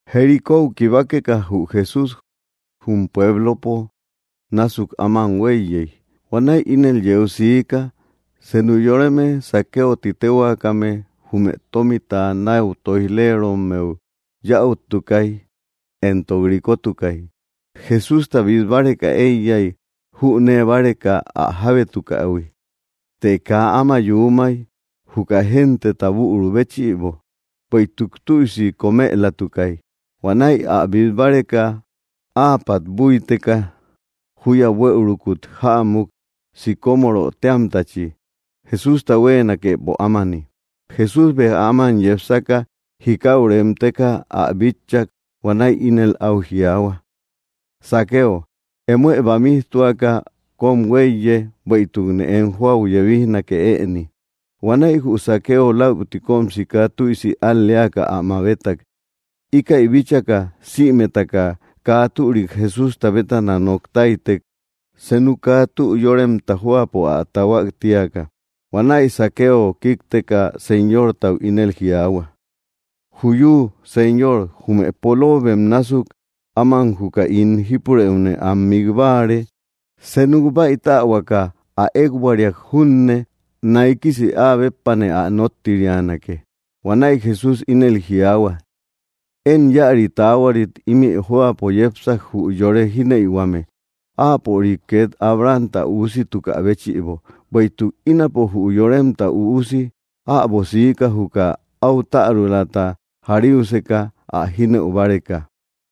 Jericóu kibakeka jü Jesús, jum pueblopo násuk áman huéiyey. Huanäi ínel yeu siika: Senu yoreme Zaqueo ti téhuaakame, jume tómita náu tóij‑lerommeu yäuttukay, éntok rikotukay. Jesústa bít báreka éiyay, jünee báreka ä jábétukähui. Të kaa áma yuumay, juka genteta büru béchïbo, bueïtuk tüisi kómëlatukay. Huanäi ä bít báreka, áapat búiteka júya buëurukut jämuk, sicómoro téamtachi, Jesústa huéenakepo ámani. Jesús béja áman yepsaka, jikau remteka ä bitchak. Huanäi ínel áu jiaahua: —Zaqueo, emoë bamijtuaka kóm huéiye, bueïtukne em jóau yebijnake ëni. Huanäi jü Zaqueo läuti kóm sika tüisi al‑leaka ä mabetak. Íkäi bíchaka, sïmetaka kaa türik Jesústa bétana nok táytek, senu kaa tü yóremta jóapo ä tahuak tíaka. Huanäi Zaqueo kíkteka, Señortau ínel jiaahua: —Juyu, Señor, jume poloobem násuk áman juka ín jípurëune am mik báare; senuk báitähuaka ä ékbuariak junne, naikisi áa béppane ä nóttirianake. Huanäi Jesús ínel jiaahua: —Én íäri taahuarit ímï jóapo yepsak, jü yore jínëiuhuame, áapörik két Abrahamta üusitukä béchïbo. Bueïtuk ínapo jü Yoremta Üusi äbo siika, juka áu tärulata jariuseka ä jínëu báreka.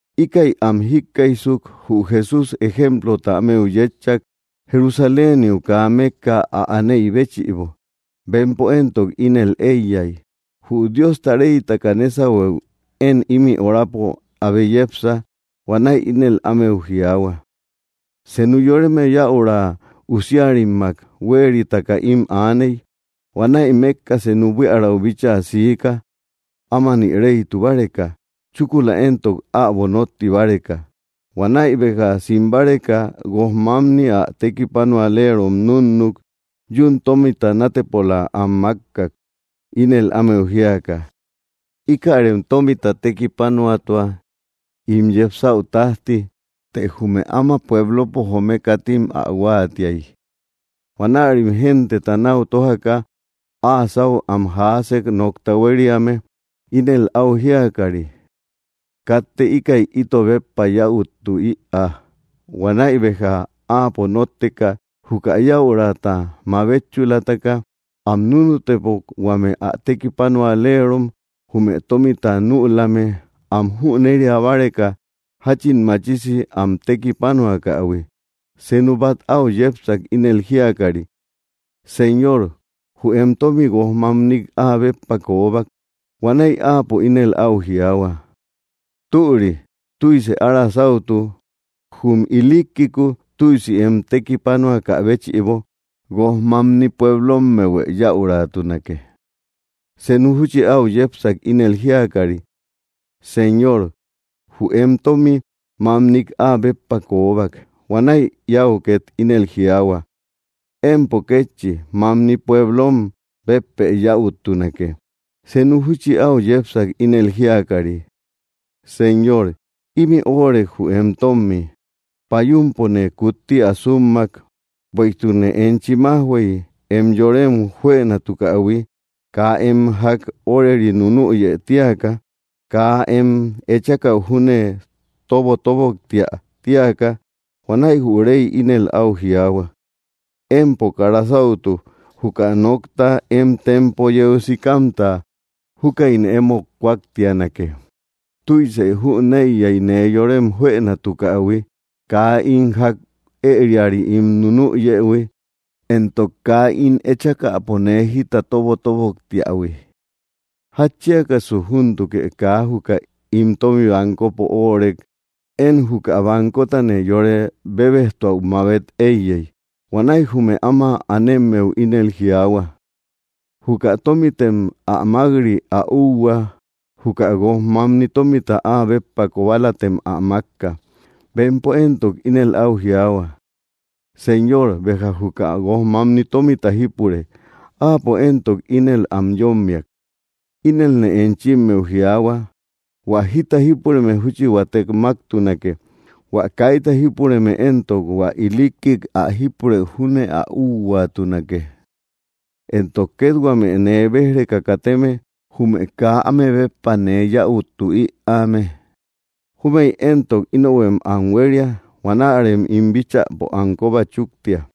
Íkäi am jíkkaijsuk, jü Jesús ejemplota ámeu yétchak, Jerusaléniu kaa mékka ä aneï béchïbo. Bempo éntok ínel éiyay: Jü Diosta reytaka nésahueu én ímï horapo abe yepsa. Huanäi ínel ámeu jiaahua: —Senu yoreme yäura usiarimmak huéeritaka ím aaney. Huanäi mékka senu buiärau bíchaa siika, ámani reytu báreka, chúkula éntok äbo nótti báreka. Huanäi béja sim báreka, guoj mamni ä tekipanualerom núnnuk. Yún tómita nátepola am mákkak, ínel ámeu jíaka: “Íkärem tómita tekipanuatua ín yepsäu tájti.” Të jume áma pueblopo joome katim ä huáatiay. Huanärim genteta náu tójaka áa sáu am jaasek nokta huériame, ínel áu jíakari: “Katte íkäi ito béppa yäuttu ïaa.” Huanäi béja áapo nótteka, juka yäurata mabetchulataka, am núnutebok huame ä tekipanualerom jume tómita nülame, am jüneria báreka jáchin machisi am tekipanuakähui. Senu bát áu yepsak, ínel jíakari: “Señor, jü em tómi, guojmamnik áa béppa koobak.” Huanäi áapo ínel áu jiaahua: “Türi, tüise ára sáutu; jum ilikkiku tüisi em tekipanuakä béchïbo, guojmamni pueblommehuë yäuratunake.” Senu júchi áu yepsak, ínel jíakari: “Señor, jü em tómi mamnik áa béppa koobak.” Huanäi íau két ínel jiaahua: “Empo kétchi mamni pueblom béppë yäuttunake.” Senu júchi áu yepsak, ínel jíakari: “Señor, ímï óorek jü em tómmi; payumpone kutti ä súmmak, bueïtukne enchi májhuey, em yórem juënatukähui, kaa em ják óreri nunüyë tíaka, kaa em echakäu júne tobotoboktiä tíaka.” Huanäi jü rey ínel áu jiaahua: “¡Empo kara sáutu! Juka nokta em tempo yeu sikamta, júkäine emót kúaktianake. Tüise jüneiya nee yorem juënatukähui, kaa ín ják ëriari ín nunüyëhui éntok kaa ín echakäpo nee jita tobotoboktiähui. Jatchiakasu ¿júntukë kaa juka ín tómi bancopo óorek, én juka bancotane yore bebejtuäu mabet éiyey?” Huanäi jume áma anemmeu ínel jiaahua: “Juka tómitem ä mák‑ri ä úhua; juka guojmamni tómita áa béppa kobalatem ä mákka.” Bempo éntok ínel áu jiaahua: “Señor, béja juka guojmamni tómita jípure.” Áapo éntok ínel am yómmiak: “Inelne enchimmeu jiaahua, hua jita jípureme júchi huatek máktunake; hua kaita jípureme éntok, hua ilikkik ä jípurëu júne ä úhuaatunake. Éntok két huame nee béj‑reka kateme, jume kaa áme béppa nee yäuttu ïaame, júmëi éntok inohuem am huéria. Huanärem ín bíchäpo am kóba chúktia.”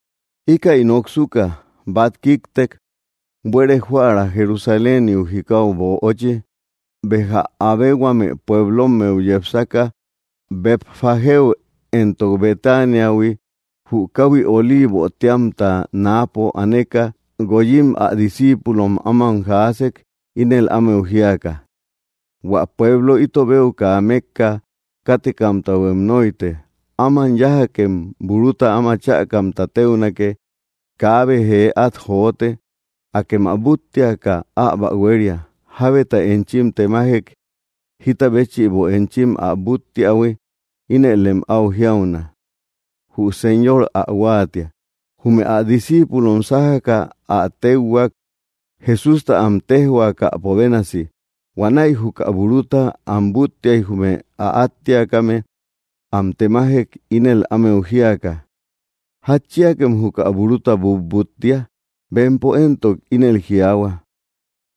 Íkäi noksuka, bát kíktek buere joära Jerusaléniu jikau böochi. Béja abe huame pueblommeu yepsaka, Betfagéu éntok Betaniahui, jü káhui Oliivo téamta náapo aneka, guoyim ä discíipulom áman jaasek, ínel ámeu jíaka: —Huä pueblou ito beu kaa mékka kátekamtahuem nóite. Áman yájakem buruta áma chäkamta téunake; kaabe jee át jote. Akem ä búttiaka, äbo ä huéria. Jábeta enchim temajek jita béchïbo enchim ä búttiähui, ínëlem áu jiauna: “Jü Señor ä huáatia.” Jume ä discíipulom sájaka, ä téuhuak, Jesústa am téjhuaakäpo bénasi. Huanäi juka buruta am búttiay jume ä áttiakame am temajek, ínel ámeu jíaka: —¿Jatchiakem juka buruta butbúttia? Bempo éntok ínel jiaahua: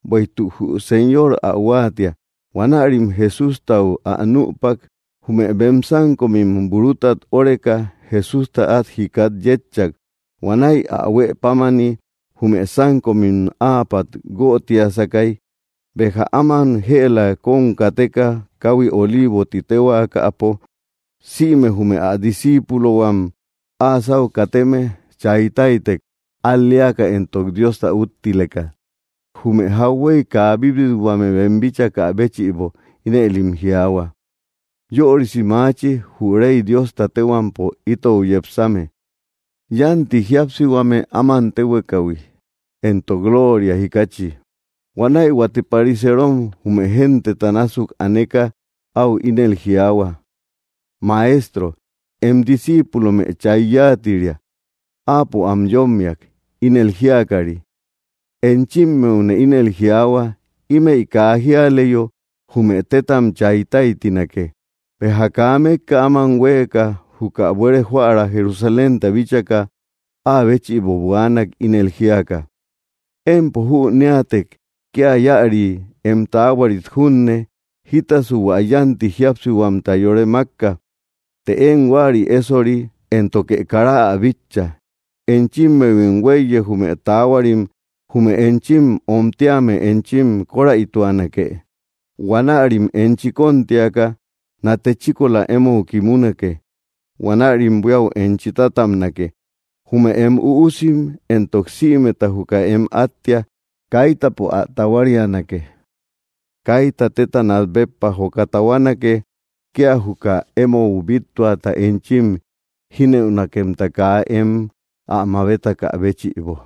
—Bueïtuk jü Señor ä huáatia. Huanärim Jesústau ä nüpak. Jume bem sánkomim burutat óreka, Jesústa át jikat yétchak. Huanäi ä huë pámani jume sánkomim áapat guötiasakay. Béja áman jëla kóm kateka kahui Oliivo ti téhuaakapo, sïme jume ä disciipulohuam áa sáu kateme chay táytek, al‑leaka éntok Diosta úttileka, jume jauhuey kaa bíbithuame bem bíchakä béchïbo. Inëlim jiaahua: —¡Yörisi maachi, jü Rey Diosta téhuampo itou yepsame! ¡Yánti jíapsihuame áman téhuekahui, éntok lóoria jikachi! Huanäi huate pariseerom jume genteta násuk aneka áu ínel jiaahua: —Maestro, em discíipulome chay yáatiria. Áapo am yómmiak, ínel jíakari: —Enchimmeune ínel jiaahua, ímëi kaa jíaleyo, jume tétam chay táytinake. Béja kaa mékka áman huéeka, juka buere joära Jerusalénta bíchaka, áa béchïbo buaanak, ínel jíaka: —¡Empo jüneätek kía íäri em taahuarit junne, jítasu hua yánti jíapsihuamta yore mákka! Të én huäri ésori, éntoke kara ä bitcha. Enchimmehuim huéiye jume taahuarim, jume enchi omtíame enchi kóräituanake. Huanärim enchi kóntiaka nate chíkola émou kimunake. Huanärim buíau enchi tátabnake; jume em üusim éntok sïmeta juka em áttiak, kaitapo ä tahuarianake. Kaita téta nat béppa joka tahuanake, kía juka émou bíttuata, enchi jínëunakemta kaa em ä mabetakä béchïbo.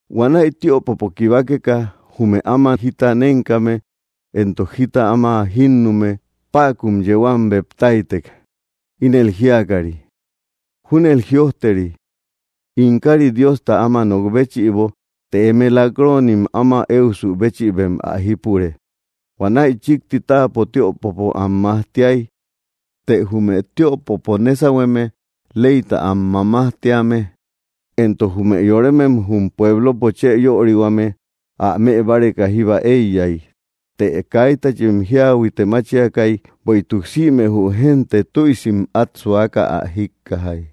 Huanäi tiöpopo kibakeka, jume áma jita nénkame éntok jita áma jínnume päkun yeu am bep táytek, ínel jíakari: —Júnel jïojteri: ‘‘In kári Diostau áma nok béchïbo”; të eme lak‑roonim áma éusu béchïbem ä jípure. Huanäi chíkti táapo tiöpopo am majtiay; të jume tiöpopo nésahueme, leyta am mamajtíame, éntok jume yoremem jum pueblopo chë yörihuame, ä mëbáreka jíba éiyay. Të kaitachim jiahuite máchiakay, bueïtuk sïme jü génte tüisim át suaka ä jíkkajay.